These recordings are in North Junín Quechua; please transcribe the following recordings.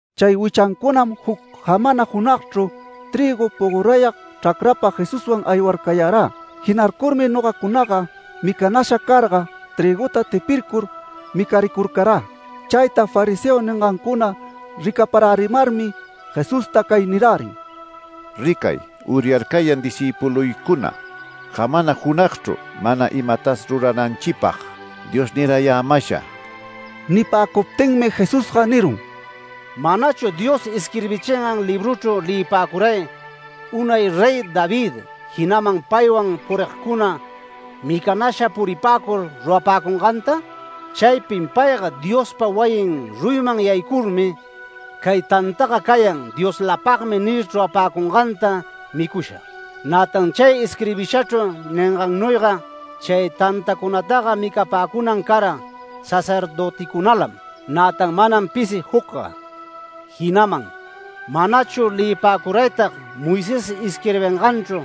Chay wichancunam juc jamana junagchru trïgu pogorayag chracrapa Jesuswan aywarcayarä. Jinarcurmi nogacunaga micanasha carga trïguta tipircur micaricurcarä. Chayta fariseo ningancuna ricaparärimarmi Jesusta cay nirärin: “Ricay, uryarcayan discïpuluycuna, jamana junagchru mana imatas rurananchipag Dios nirayämasha”. Nipäcuptinmi Jesusga nirun: “¿Manachu Dios isquirbichingan libruchru leyipäcuray, unay Rey David jinaman paywan purigcuna micanasha puripäcur rurapäcunganta? Chaypin payga Diospa wayin ruyiman yaycurmi ‘Cay tantaga cayan Dioslapagmi’ nir chrurapäcunganta micusha. Nätan chay isquirbishachru ningannuyga chay tantacunataga micapäcunan cara sacerdöticunalam, nätan manam pisi jucga. Jinaman ¿manachu leyipäcuraytag Moisés isquirbinganchru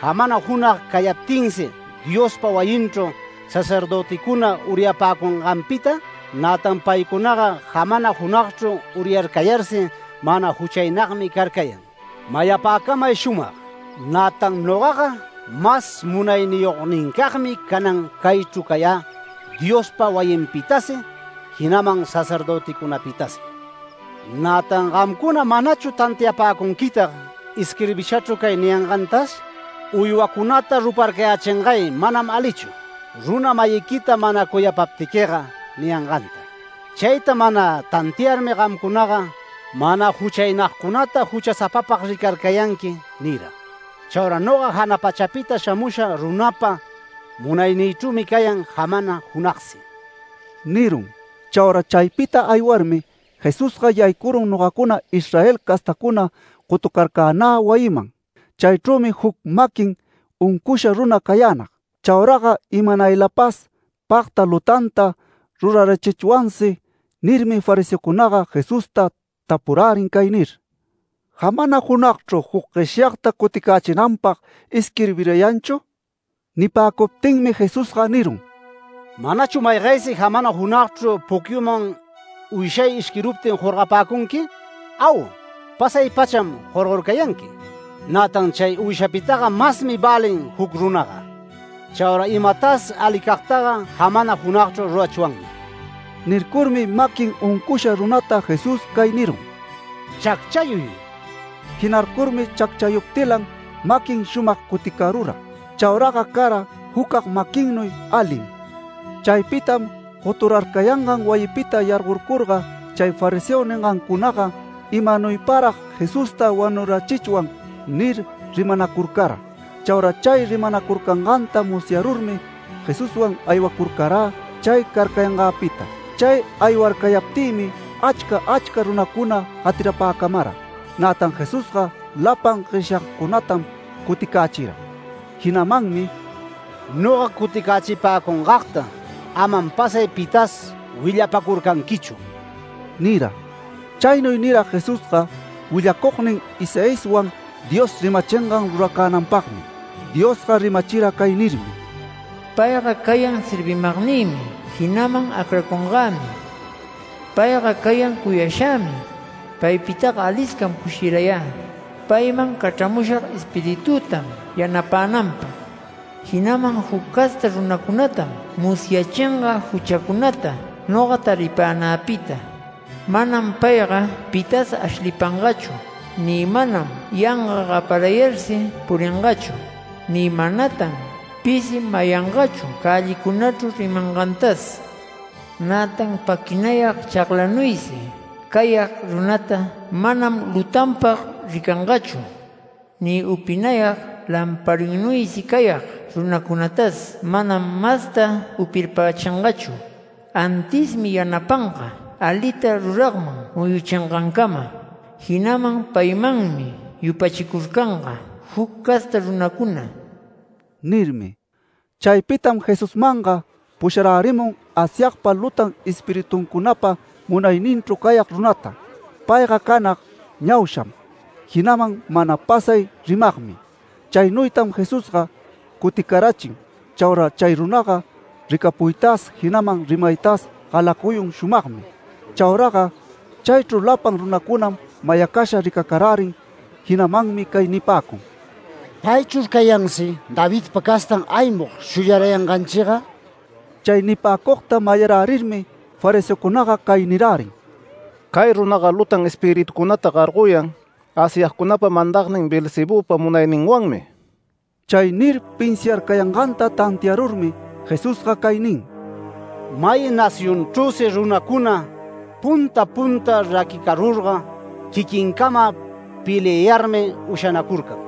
jamana junag cayaptinsi Diospa wayinchru sacerdöticuna uryapäcunganpita? Nätan paycunaga jamana junagchru uryarcayarsi mana juchaynagmi carcayan. Mayapäcamay shumag: ¡Nätan nogaga mas munayniyognincagmi canan caychru cayä Diospa wayinpitasi jinaman sacerdöticunapitasi! ¿Nätan gamcuna manachu tantiapäcunquitag isquirbishachru cay niyangantas? ‘Uywacunata ruparcayächingay manam alichu, runa-mayiquita mana cuyapaptiquiga’ niyanganta. Chayta mana tantiarmi gamcunaga mana juchaynagcunata ‘Juchäsapapag ricarcayanqui’ nira. Chaura noga jana pachapita shamusha runapa munaynïchrümi cayan jamana junagsi” nirun. Chaura chaypita aywarmi Jesusga yaycurun nogacuna Israel castacuna gotucarcänä wayiman. Chaychrümi juc maquin uncusha runa cayänag. Chauraga imanaylapas “Pagta lutanta rurarachichwansi” nirmi fariseocunaga Jesusta tapurärin cay nir: “¿Jamana junagchru juc gueshyagta cuticächinanchipag isquirbirayanchu?” Nipäcuptinmi Jesusga nirun: “¿Manachu maygaysi jamana junagchru pucyuman uyshay ishquiruptin jorgapäcunqui? Au, pasay-pacham jorgorcayanqui. Nätan chay uyshapitaga masmi välin juc runaga. Chaura imatas alicagtaga jamana junagchru rurachwanmi”. Nircurmi maquin uncusha runata Jesús cay nirun: “Chacchayuy”. Jinarcurmi chacchayuptilan maquin shumag cuticarura. Chauraga cara jucag maquinnuy alim. Chaypitam goturarcayangan wayipita yargorcurga chay fariseo ningancunaga “¿Imanuyparag Jesusta wanurachichwan?” nir rimanacurcara. Chaura chay rimanacurcanganta musyarurmi Jesuswan aywacurcarä chay carcayangäpita. Chay aywarcayaptïmi achca achca runacuna gatirapäcamara. Nätan Jesusga lapan gueshyagcunatam cuticächira. Jinamanmi “Noga cuticächipäcungagta amam pasay pitas willapacurcanquichu” nira. Chaynuy nira Jesusga willacugnin Isaiaswan Dios rimachingan ruracänanpagmi. Diosga rimachira cay nirmi: “Payga cayan servimagnïmi jinaman acracungämi. Payga cayan cuyashämi. Paypitaga aliscam cushirayä. Payman cachramushag Espiritütam yanapänanpag. Jinaman juc casta runacunatam musyachinga juchacunata noga taripänäpita. Manam payga pitas ashlipangachu, ni manam yanga gaparayarsi puringachu, ni manatan pisi mayangachu cällicunachru rimangantas. Nätan paquinayag chaglanuysi cayag runata manam lutanpag ricangachu, ni upinayag lamparinnuysi cayag runacunatas manam masta upirpachingachu. Antismi yanapanga alita ruragman muyuchingancama. Jinaman paymanmi yupachicurcanga juc casta runacuna” nirmi. Chaypitam Jesusmanga pusharärimun Asyagpa lutan espirituncunapa munayninchru cayag runata. Payga canag ñausham, jinaman mana pasay rimagmi. Chaynuytam Jesusga cuticarachin. Chaura chay runaga ricapuytas jinaman rimaytas galacuyun shumagmi. Chauraga chaychru lapan runacunam mayacasha ricacarärin. Jinamanmi cay nipäcun: “¿Paychur cayansi Davidpa castan aymug shuyarayanganchiga?” Chay nipäcugta mayarärirmi fariseocunaga cay nirärin: “Cay runaga lutan espiritucunata gargoyan Asyagcunapa mandagnin Beelzebüpa munayninwanmi”. Chay nir pinsiarcayanganta tantiarurmi Jesusga cay nin: “May nacionchrüsi runacuna punta punta raquicarurga quiquincama peliayälarmi ushanacurcan.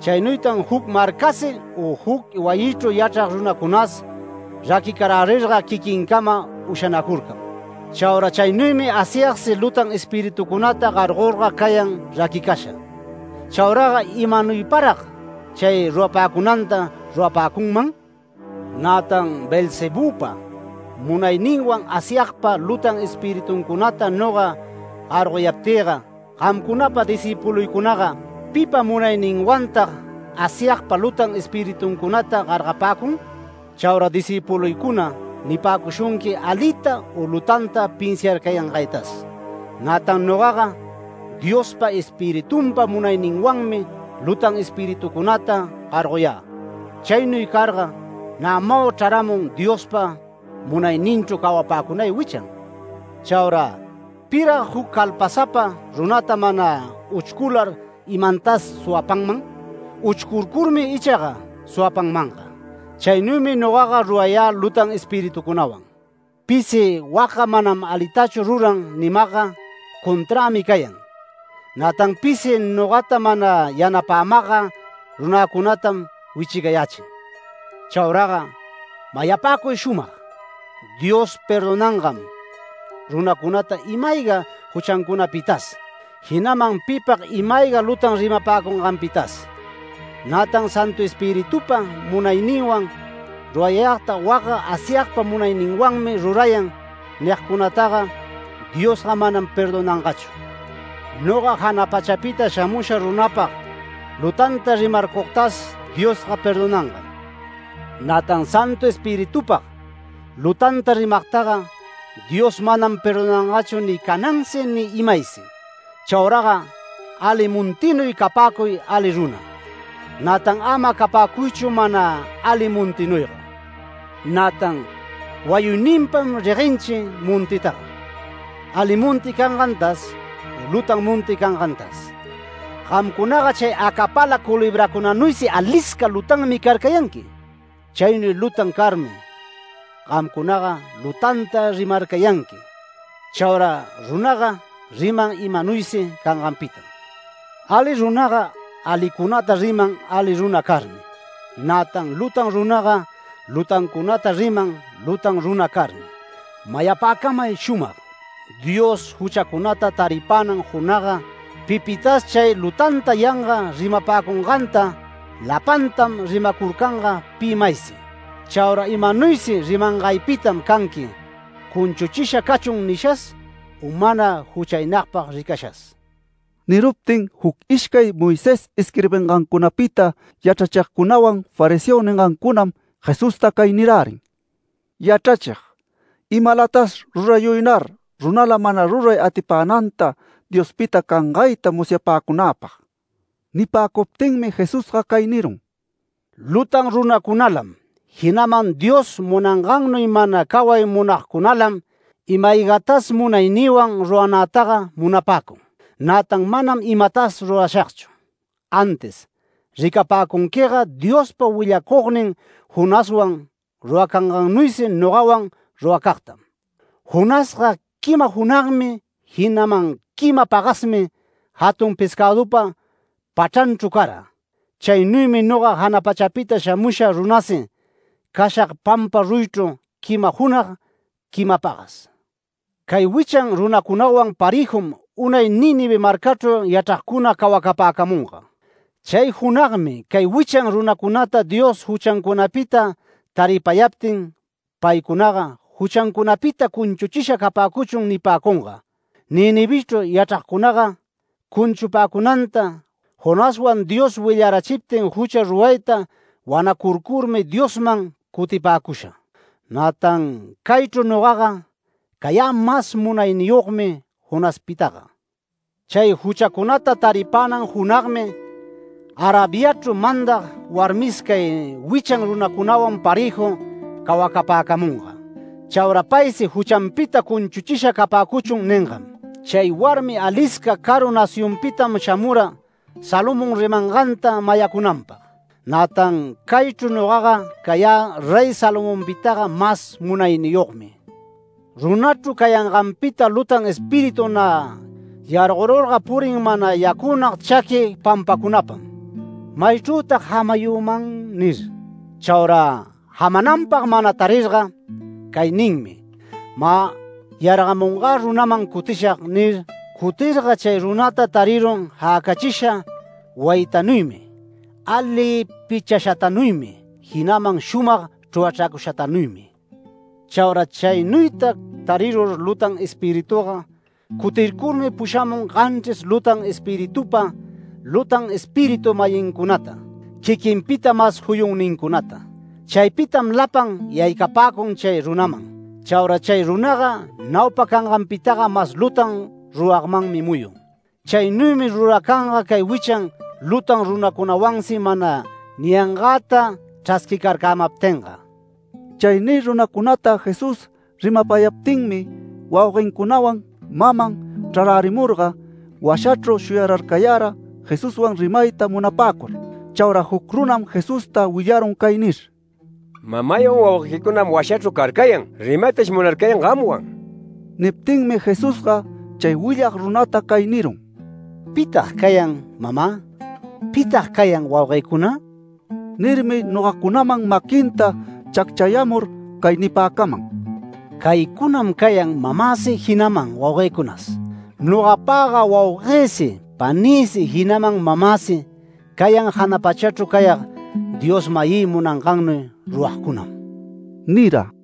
Chaynuytan juc marcasi u juc wayichru yachrag runacunas raquicarärirga quiquincamam ushanacurcan. Chaura chaynuymi Asyagsi lutan espiritucunata gargorga cayan raquicasha. ¿Chauraga imanuyparag chay rurapäcunanta rurapäcunman? Nätan Beelzebüpa munayninwan Asyagpa lutan espirituncunata noga gargoyaptïga, gamcunapa discïpuluycunaga ¿pipa munayninwantag Asyagpa lutan espirituncunata gargapäcun? Chaura discïpuluycuna nipäcushunqui alita u lutanta pinsiarcayangaytas. Nätan nogaga Diospa Espiritunpa munayninwanmi lutan espiritucunata gargoyä. Chaynuy carga nämau chraramun Diospa munayninchru cawapäcunay wichan. Chaura ¿pirag juc calpasapa runata mana uchcular imantas suwapanman? Uchcurcurmi ichaga suwapanmanga. Chaynuymi nogaga rurayä lutan espiritucunawan. Pisi ‘Wacga manam alitachu ruran’ nimagga conträmi cayan. Nätan pisi nogata mana yanapämagga runäcunatam wichicayächin. Chauraga mayapäcuy shumag: Dios perdonangam runacunata ima-ayga juchancunapitas jinaman pipag ima-ayga lutan rimapäcunganpitas. Nätan Santu Espiritupa munayninwan rurayagta wacga ‘Asyagpa munayninwanmi rurayan’ nigcunataga Diosga manam perdonangachu. Noga jana pachapita shamusha runapag lutanta rimarcugtas Diosga perdonangam. Nätan Santu Espiritupag lutanta rimagtaga Dios manam perdonangachu ni canansi ni imaysi”. “Chauraga ali montinuy capäcuy ali runa. Nätan ama capäcuychu mana ali montinuyga. Nätan wayuyninpam reguenchi montitaga, ali monti cangantas u lutanta monti cangantas. ¡Gamcunaga chay acapala culebracunanuysi alisca lutanmi carcayanqui! Chaynuy lutan carmi gamcunaga lutanta rimarcayanqui. Chaura runaga riman imanuysi canganpitam. Ali runaga alicunata riman ali runa carmi. Nätan lutan runaga lutancunata riman lutan runa carmi. Mayapäcamay shumag: Dios juchacunata taripänan junagga pipitas chay lutanta yanga rimapäcunganta lapantam rimacurcanga pi maysi. Chaura imanuysi rimangaypitam canqui ‘Cunchuchisha cachun’ nishas u mana juchaynagpag ricashas”. Niruptin juc ishcay Moisés isquirbingancunapita yachrachigcunawan fariseo ningancunam Jesusta cay nirärin: “Yachrachig, imalatas rurayuynar runala mana ruray atipänanta Diospita cangayta musyapäcunäpag”. Nipäcuptinmi Jesusga cay nirun: “Lutan runacunalam, jinaman Dios munangannuy mana caway munagcunalam ima-aygatas munaynïwan ruranätaga munapäcun. Nätan manam imatas rurashagchu. Antis ricapäcunquiga Diospa willacugnin Jonaswan ruracangannuysi nogawan ruracagtam. Jonasga quima junagmi jinaman quima pagasmi jatun pescädupa pachranchru cara. Chaynuymi noga jana pachapita shamusha runasi cashag pampa ruyichru quima junag, quima pagas. Cay wichan runacunawan parëjum unay Nínive marcachru yachragcuna cawacapäcamunga. Chay junagmi cay wichan runacunata Dios juchancunapita taripayaptin paycunaga ‘Juchancunapita cunchuchisha capäcuchun’ nipäcunga. Ninivechru yachragcunaga cunchupäcunanta Jonaswan Dios willarachiptin jucha rurayta wanacurcurmi Diosman cutipäcusha. Nätan caychru nogaga cayä mas munayniyogmi Jonaspitaga. Chay juchacunata taripänan junagmi Arabiachru mandag warmis cay wichan runacunawan parëju cawacapäcamunga. Chaura paysi ‘Juchanpita cunchuchisha capäcuchun’ ningam: Chay warmi alisca caru nacionpitam shamura Salomón rimanganta mayacunanpag. Nätan caychru nogaga cayä Rey Salomonpitaga mas munayniyogmi”. “Runachru cayanganpita lutan espíritu nä yargorurga purin mana yacünag chaqui pampacunapam ‘¿Maychrütag jamayüman?’ nir. Chaura jamananpag mana tarirga cay ninmi: ‘Mä yargamungä runaman cutishag’ nir, cutirga chay runata tarirun jäcachisha wayitanuymi ali pichashatanuymi jinaman shumag chrurachracushatanuymi. Chaura chaynuyta tarirur lutan espirituga cutircurmi pushamun ganchris lutan espiritupa lutan espiritu-mayincunata, quiquinpita mas juyunnincunata. Chaypitam lapan yaycapäcun chay runaman. Chaura chay runaga naupa canganpitaga mas lutan ruragmanmi muyun. Chaynuymi ruracanga cay wichan lutan runacunawansi mana niyangäta chrasquicarcämaptinga”. Chay nir runacunata Jesús rimapayaptinmi wauguencunawan maman chrarärimurga, washachru shuyararcayara Jesuswan rimayta munapäcur. Chaura juc runam Jesusta willarun cay nir: “Mamaywan wauguequicunam washachru carcayan rimaytash munarcayan gamwan”. Niptinmi Jesusga chay willag runata cay nirun: “¿Pitag cayan mamä? ¿Pitag cayan wauguëcuna?” Nirmi nogacunaman maquinta chacchayämur cay nipäcaman: “Caycunam cayan mamäsi jinaman wauguëcunas. Nogapaga wauguësi panïsi jinaman mamäsi cayan jana pachachru cayag Dios-mayï munangannuy ruragcunam” nira.